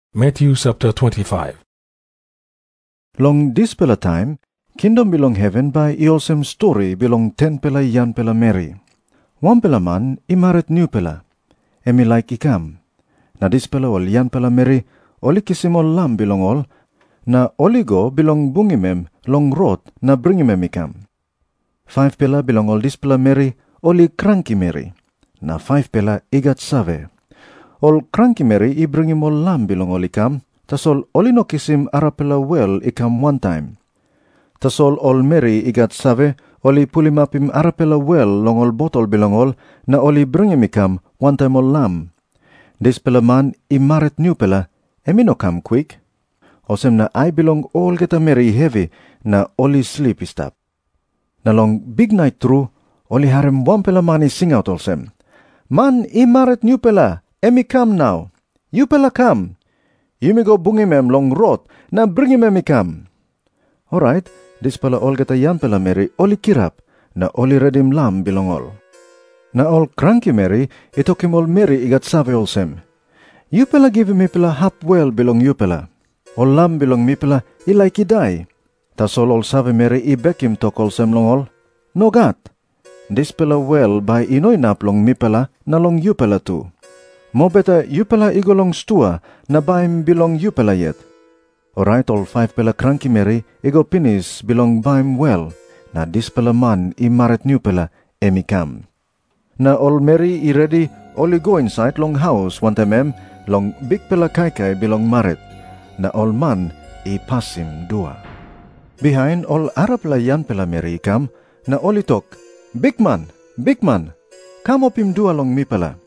Jisas i tok moa olsem, “Long dispela taim kingdom bilong heven bai i olsem stori bilong 10-pela yangpela meri. Wanpela man i marit nupela, em i laik i kam. Na dispela ol yangpela meri ol i kisim ol lam bilong ol, na ol i go bilong bungim em long rot na bringim em i kam. 25-pela bilong ol dispela meri ol i kranki meri, na 5-pela i gat save. Ol kranki meri i bringim ol lam bilong ol i kam, tasol ol i no kisim arapela wel i kam wantaim. Tasol ol meri i gat save, ol i pulimapim arapela wel long ol botol bilong ol na ol i bringim i kam wantaim ol lam. Dispela man i marit nupela em i no kam kwik, olsem na ai bilong olgeta meri i hevi na ol i slip i stap. “Na long biknait tru ol i harim wanpela man i singaut olsem, ‘Man i marit nupela em i kam nau. Yupela kam, yumi go bungim em long rot na bringim em i kam.’ Orait dispela olgeta yangpela meri ol i kirap, na ol i redim lam bilong ol. Na ol kranki meri i tokim ol meri i gat save olsem, ‘Yupela givim mipela hap wel bilong yupela. Ol lam bilong mipela i laik i dai.’ Tasol ol savemeri i bekim tok olsem long ol, ‘Nogat. Dispela wel bai i no inap long mipela na long yupela tu. Mobeta yupela i go long stua na baim bilong yupela yet.’ Orait ol 5-pela kranki meri i go pinis bilong baim wel, na dispela man i marit nupela em i kam. Na ol meri i redi ol i go insait long haus wantaim em long bikpela kaikai bilong marit. Na ol man i pasim dua. “Bihain ol arapela yangpela meri i kam, na ol i tok, ‘Bikman, bikman, kam opim dua long mipela.’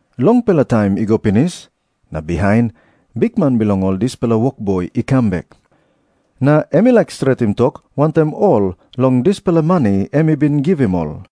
“Longpela taim i go pinis, na bihain bikman bilong ol dispela wokboi i kam bek. Na em i laik stretim tok wantaim ol long dispela mani em i bin givim ol.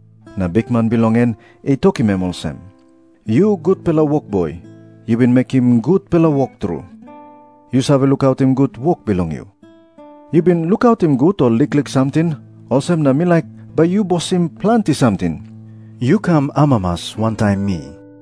Na bikman bilong en i tokim em olsem, ‘Yu gutpela wokboi, yu bin mekim gutpela wok tru. Yu save lukautim gut wok bilong yu. Yu bin lukautim gut ol liklik samting, olsem na mi laik bai yu bosim planti samting. Yu kam amamas wantaim mi.’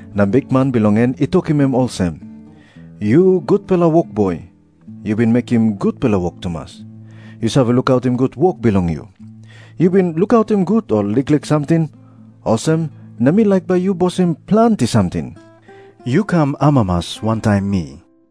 Na bikman bilong en i tokim em olsem, ‘Yu gutpela wokboi, yu bin mekim gutpela wok tumas. Yu save lukautim gut wok bilong yu. Yu bin lukautim gut ol liklik samting, olsem na mi laik bai yu bosim planti samting. Yu kam amamas wantaim mi.’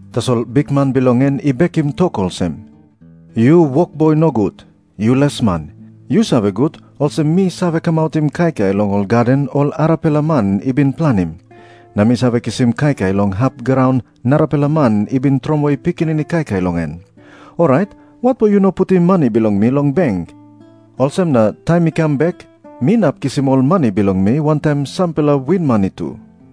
“Tasol bikman bilong en i bekim tok olsem, ‘Yu wokboi nogut. Yu lesman. Yu save gut olsem mi save kamautim kaikai long ol gaden ol arapela man i bin planim, na mi save kisim kaikai long hap graun narapela man i bin tromoi pikinini kaikai long en. Orait watpo yu no putim mani bilong mi long beng? Olsem na taim mi kam bek mi inap kisim ol mani bilong mi wantaim sampela winmani tu.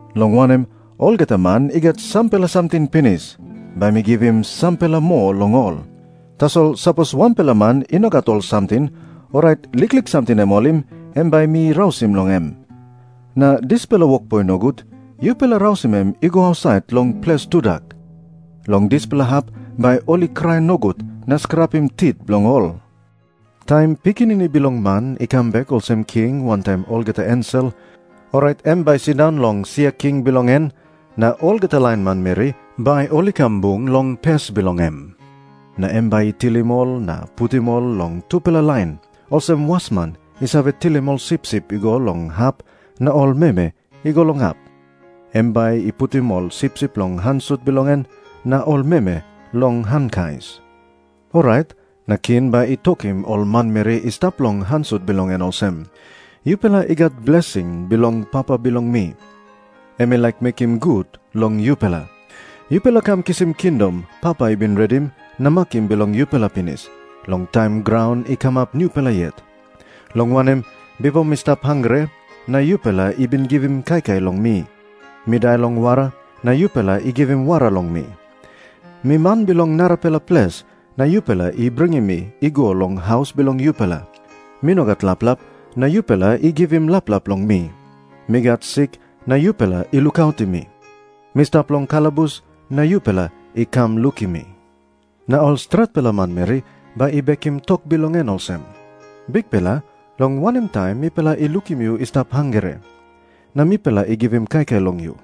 Long wanem, olgeta man i gat sampela samting pinis, bai mi givim sampela moa long ol. Tasol sapos wanpela man i no gat ol samting, orait liklik samting em i holim, em bai mi rausim long em. Na dispela wokboi nogut, yupela rausim em i go ausait long ples tudak. Long dispela hap bai ol i krai nogut na skrapim tit bilong ol.’” Jisas i tok moa olsem, “Taim Pikinini Bilong Man i kam bek olsem king wantaim olgeta ensel, orait em bai i sindaun long sia king bilong en. Na olgeta lain manmeri bai ol i kam bung long pes bilong em. Na em bai i tilim ol na putim ol long tupela lain, olsem wasman i save tilim ol sipsip i go long hap na ol meme i go long hap. Em bai i putim ol sipsip long han sut bilong en, na ol meme long han kais. Orait na king bai i tokim ol manmeri i stap long han sut bilong en olsem, ‘Yupela i gat blesing bilong Papa bilong mi. Em i laik mekim gut long yupela. Yupela kam kisim kingdom Papa i bin redim na makim bilong yupela pinis, long taim graun i kamap nupela yet. Long wanem, bipo mi stap hangre, na yupela i bin givim kaikai long mi. Mi dai long wara, na yupela i givim wara long mi. Mi man bilong narapela ples na yupela i bringim mi i go long haus bilong yupela. Mi no gat laplap, na yupela i givim laplap long mi. Mi gat sik na yupela i lukautim mi. Mi stap long kalabus, na yupela i kam lukim mi.’ “Na ol stretpela manmeri bai i bekim tok bilong en olsem, ‘Bikpela, long wanem taim mipela i lukim yu i stap hangre, na mipela i givim kaikai long yu?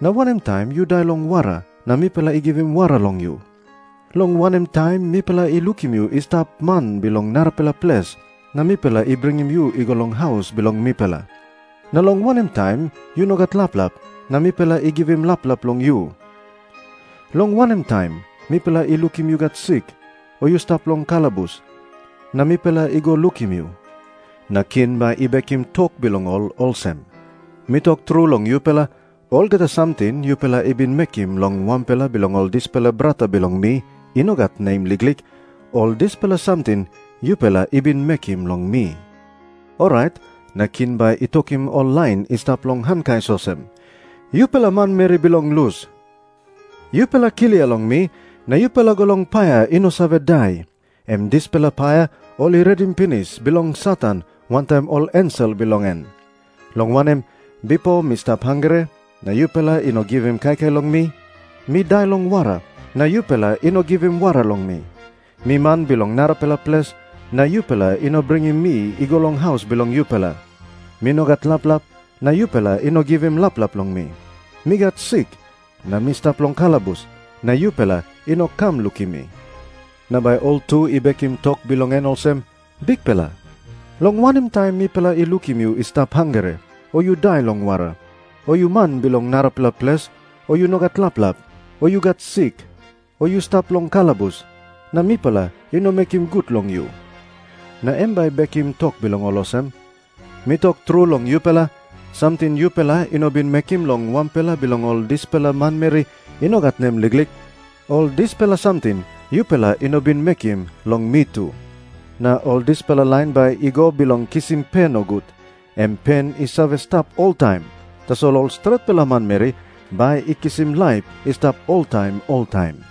Na wanem taim yu dai long wara, na mipela i givim wara long yu? Long wanem taim mipela i lukim yu i stap man bilong narapela ples, na mipela i bringim yu i go long haus bilong mipela? Na long wanem taim yu no gat laplap, na mipela i givim laplap long yu? Long wanem taim mipela i lukim yu gat sik, o yu stap long kalabus, na mipela i go lukim yu?’ “Na king bai i bekim tok bilong ol olsem, ‘Mi tok tru long yupela, olgeta samting yupela i bin mekim long wanpela bilong ol dispela brata bilong mi i no gat nem liklik, ol dispela samting yupela i bin mekim long mi.’ “Orait na king bai i tokim ol lain i stap long han kais olsem, ‘Yupela manmeri bilong lus, yupela klia long mi na yupela go long paia i no save dai, em dispela paia ol i redim pinis bilong Satan wantaim ol ensel bilong en. Long wanem, bipo mi stap hangre, na yupela i no givim kaikai long mi. Mi dai long wara, na yupela i no givim wara long mi. Mi man bilong narapela ples, na yupela i no bringim mi i go long haus bilong yupela. Mi no gat laplap, na yupela i no givim laplap long mi. Mi gat sik, na mi stap long kalabus, na yupela i no kam lukim mi.’ “Na bai ol tu i bekim tok bilong en olsem, ‘Bikpela, long wanem taim mipela i lukim yu i stap hangre, o yu dai long wara, o yu man bilong narapela ples, o yu no gat laplap, o yu gat sik, o yu stap long kalabus, na mipela i no mekim gut long yu?’ “Na em bai i bekim tok bilong ol olsem, ‘Mi tok tru long yupela, samting yupela i no bin mekim long wanpela bilong ol dispela manmeri i no gat nem liklik, ol dispela samting yupela i no bin mekim long mi tu.’ Na ol dispela lain bai i go bilong kisim pe nogut, em pen i save stap oltaim. Tasol ol stretpela manmeri bai i kisim laip i stap oltaim oltaim.”